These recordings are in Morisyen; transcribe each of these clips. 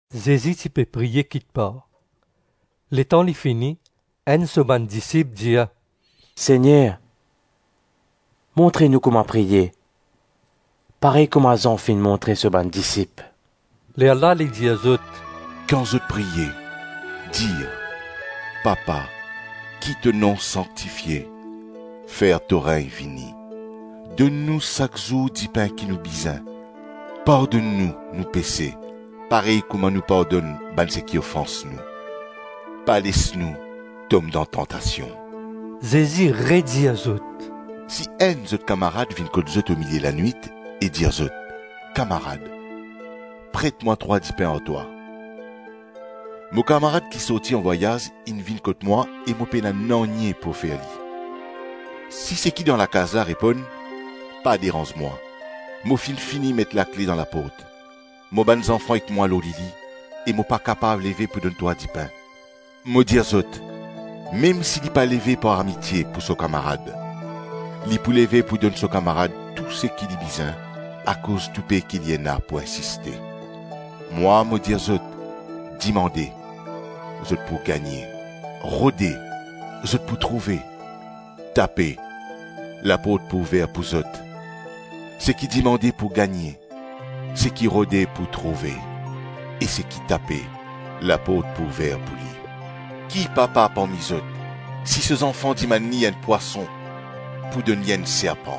Zezi ti pe priye kikpar. Letan li fini, enn so bann disip dir, “Segner, montre nou kouma priye, parey kouma Zan finn montre so bann disip.” Lerla li dir zot, “Kan zot priye, dir: Papa, ki to nom sanktifie; fer to regn vini. Donn nou sak zour dipin ki nou bizin. Pardonn nou nou pese, parey kouma nou pardonn bann seki ofans nou. Pa les nou tom dan tantasion.” Zezi redir zot, “Si enn zot kamarad vinn kot zot omilie lanwit e dir zot, ‘Kamarad, pret mwa trwa dipin ar twa.’ Mo kamarad ki sorti an vwayaz inn vinn kot mwa e mo pena nanye pou ofer li. Si seki dan lakaz la reponn, ‘Pa deranz mwa, mo finn fini met lakle dan laport, mo bann zanfan ek mwa lor lili e mo pa kapav leve pou donn twa dipin.’ Mo dir zot, mem si li pa leve par amitie pou so kamarad, li pou leve pou donn so kamarad tou seki li bizin akoz toupe ki li ena pou insiste. Mwa, mo dir zot: dimande, zot pou gagne; rode, zot pou trouve; tape, laport pou ouver pou zot. Seki dimande pou gagne, seki rode pou trouve, e seki tape, laport pou ouver pou li. Ki papa parmi zot, si so zanfan dimann li enn pwason, pou donn li enn serpan?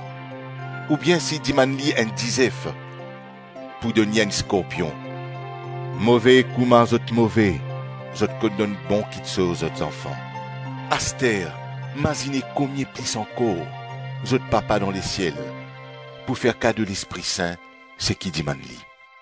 Oubien si li dimann enn dizef, pou donn li enn skorpion? Move kouma zot move, zot konn donn bon kiksoz zot zanfan; aster mazine komie plis ankor, zot Papa dan lesiel pou fer kado Lespri Sin seki dimann li.”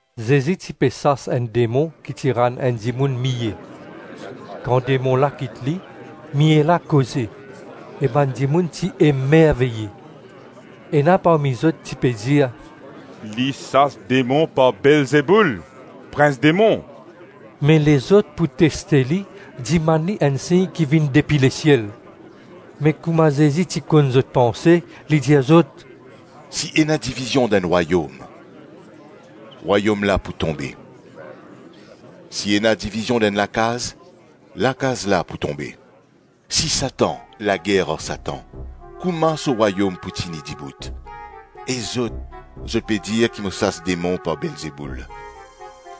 Zezi ti pe sas enn demon ki ti rann enn dimoun miye. Kan demon la kit li, miye la koze, e bann dimoun ti emerveye. Ena parmi zot ti pe dir, “Li sas demon par Belzeboul, prins demon.” Me lezot pou teste li, dimann li enn sign ki vinn depi lesiel. Me kouma Zezi ti konn zot panse, li dir zot, “Si ena divizion dan enn rwayom, rwayom la pou tonbe; si ena divizion dan enn lakaz, lakaz la pou tonbe. Si Satan lager ar Satan, kouma so rwayom pou tini dibout? E zot, zot pe dir ki mo sas demon par Belzeboul.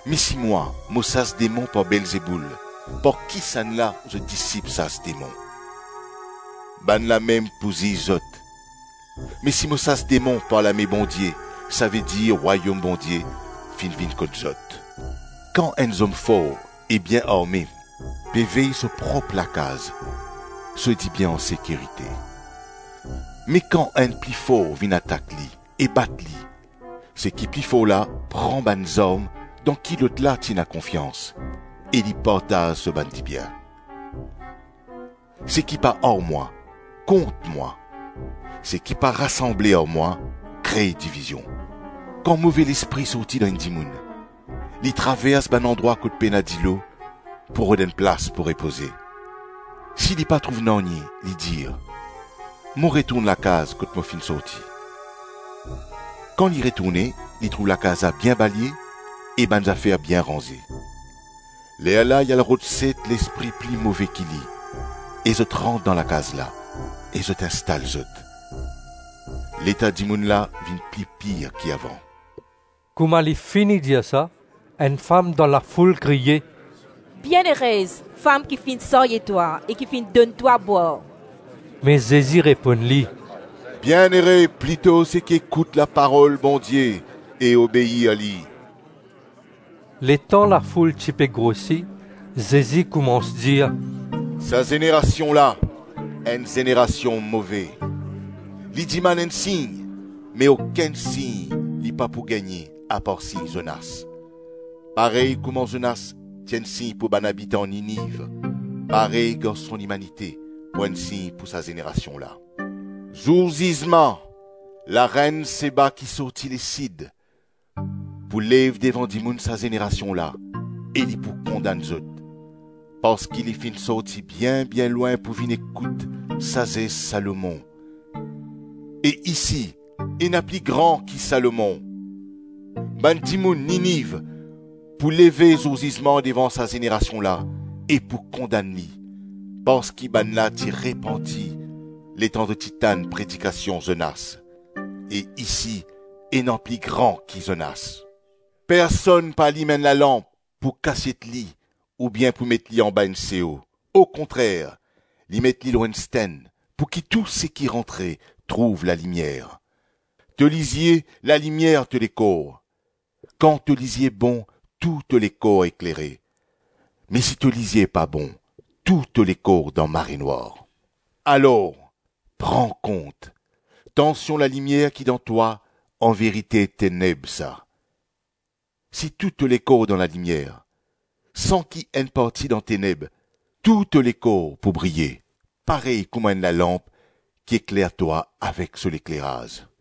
Me si mwa mo sas demon par Belzeboul, par kisannla zot disip sas demon? Bannla mem pou ziz zot. Me si mo sas demon par lame Bondie, savedir Rwayom Bondie finn vinn kot zot. Kan enn zom for e bien arme pe vey so prop lakaz, so dibien an sekirite. Me kan enn pli for vinn atak li e bat li, seki pli for la pran bann zarm dan ki lotla ti ena konfians, e li partaz so bann dibien. Seki pa ar mwa, kont mwa; seki pa rasanble ar mwa, kre divizion. Kan move lespri sorti dan enn dimoun, li travers bann landrwa kot pena dilo pou rod enn plas pou repoze; si li pa trouv nanye li dir, ‘Mo retourn lakaz kot mo finn sorti.’ Kan li retourne li trouv lakaz la bien balye e bann zafer bien ranze. Lerla li al rod set lespri pli move ki li, e zot rant dan lakaz la e zot instal zot. Leta dimoun la vinn pli pir ki avan.” Kouma li fini dir sa, enn fam dan lafoul kriye, “Bienerez fam ki finn sarye twa e ki finn donn twa bwar!” Me Zezi reponn li, “Bienere plito seki ekout laparol Bondie e obeir li!” Letan lafoul ti pe grosi, Zezi koumans dir, “Sa zenerasion la, enn zenerasion move. Li dimann enn sign, me okenn sign li pa pou gagne, apar sign Zonas. Parey kouma Zonas ti enn sign pou bann abitan Niniv, parey Garson Limanite pou enn sign pou sa zenerasion la. Zour zizman, larenn Seba ki sorti lesid, pou lev devan dimoun sa zenerasion la e li pou kondann zot; parski li finn sorti bien-bien lwin pou vinn ekout sazes Salomon. E isi ena pli gran ki Salomon. Bann dimoun Niniv pou leve zour zizman devan sa zenerasion la e pou kondann li, parski bannla ti repanti letan zot ti tann predikasion Zonas. E isi ena pli gran ki Zonas. Personn pa alim enn lalanp pou kasiet li oubien pou met li anba enn seo; okontrer li met li lor enn stenn, pouki tou seki rantre trouv lalimier. To lizie lalimier to lekor; kan to lizie bon tou to lekor eklere; me si to lizie pa bon, tou to lekor dan marenwar. Alors, pran kont, tansion lalimier ki dan twa, anverite teneb sa. Si tou to lekor dan lalimier, san ki enn parti dan teneb, tou to lekor pou briye parey kouma enn lalanp ki ekler twa avek so lekleraz.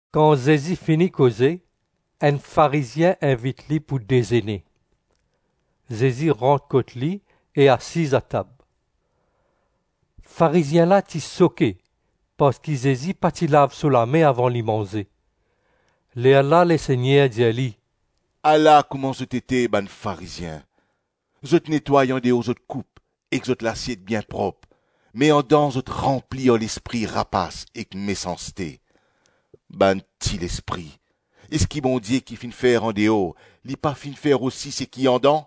Kan Zezi fini koze, enn Farizien invit li pou dezene. Zezi rant kot li e asiz atab. Farizien la ti soke parski Zezi pa ti lav so lame avan li manze. Lerla Lesegner dir li, “Ala kouma zot ete bann Farizien. Zot netway andeor zot koup ek zot lasiet bien prop, me andan zot ranpli ar lespri rapas ek mesanste. Bann tilespri! Eski Bondie ki finn fer andeor, li pa finn fer osi seki andan?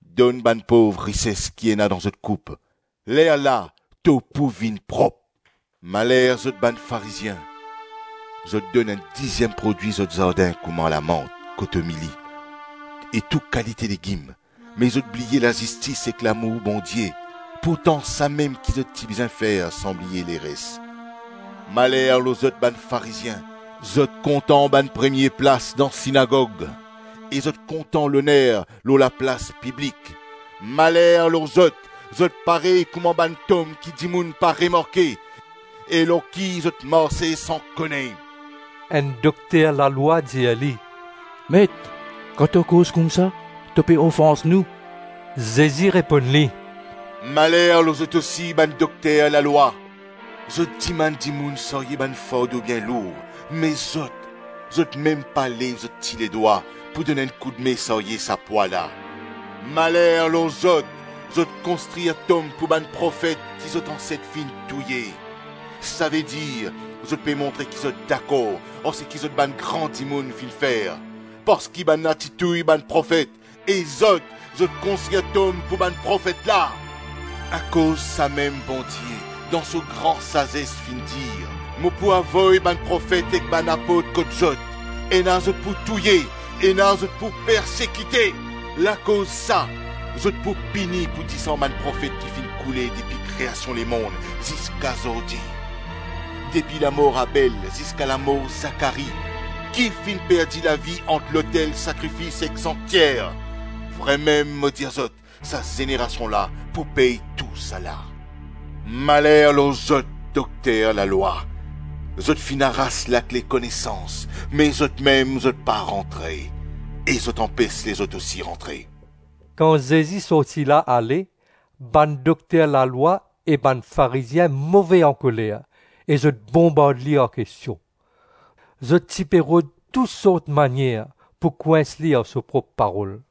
Donn bann pov rises ki ena dan zot koup; lerla, tou pou vinn prop. Maler lor zot bann Farizien! Zot donn enn diziem prodwi zot zardin kouma lamant, kotomili e tou kalite legim; me zot bliye lazistis ek lamour Bondie; pourtan samem ki zot ti bizin fer san bliye leres. Maler lor zot bann Farizien! Zot kontan bann premie plas dan sinagog e zot kontan loner lor laplas piblik. Maler lor zot! Zot parey kouma bann tom ki dimoun pa remarke, e lor ki zot marse san kone!” Enn dokter lalwa dir li, “Met, kan to koz koumsa to pe ofans nou!” Zezi reponn li, “Maler lor zot osi bann dokter lalwa! Zot dimann dimoun sarye bann fardo bien lour, me zot, zot mem pa lev zot ti ledwa pou donn enn koudme sarye sa pwa la. Maler lor zot! Zot konstrir tom pou bann profet ki zot anset finn touye. Savedir, zot pe montre ki zot dakor ar seki zot bann gran dimoun finn fer, parski bannla ti touy bann profet, e zot, zot konstrir tom pou bann profet la. Akoz samem Bondie dan so gran sazes finn dir, ‘Mo pou avoy bann profet ek bann apot kot zot; ena zot pou touye, ena zot pou persekite.’ Lakoz sa, zot pou pini pou disan bann profet ki finn koule depi kreasion lemonn ziska zordi - depi lamor Abel ziska lamor Zakari ki finn perdi lavi ant lotel sakrifis ek sanktyer. Vremem, mo dir zot, sa zenerasion la pou pey tousala. Maler lor zot, dokter lalwa! Zot finn aras lakle konesans me zotmem zot pa rantre, e zot anpes lezot osi rantre. Kan Zezi sorti la ale, bann dokter lalwa e bann Farizien move ankoler e zot bonbard li ar kestion. Zot ti pe rod tou sort manier pou kwins li ar so prop parol.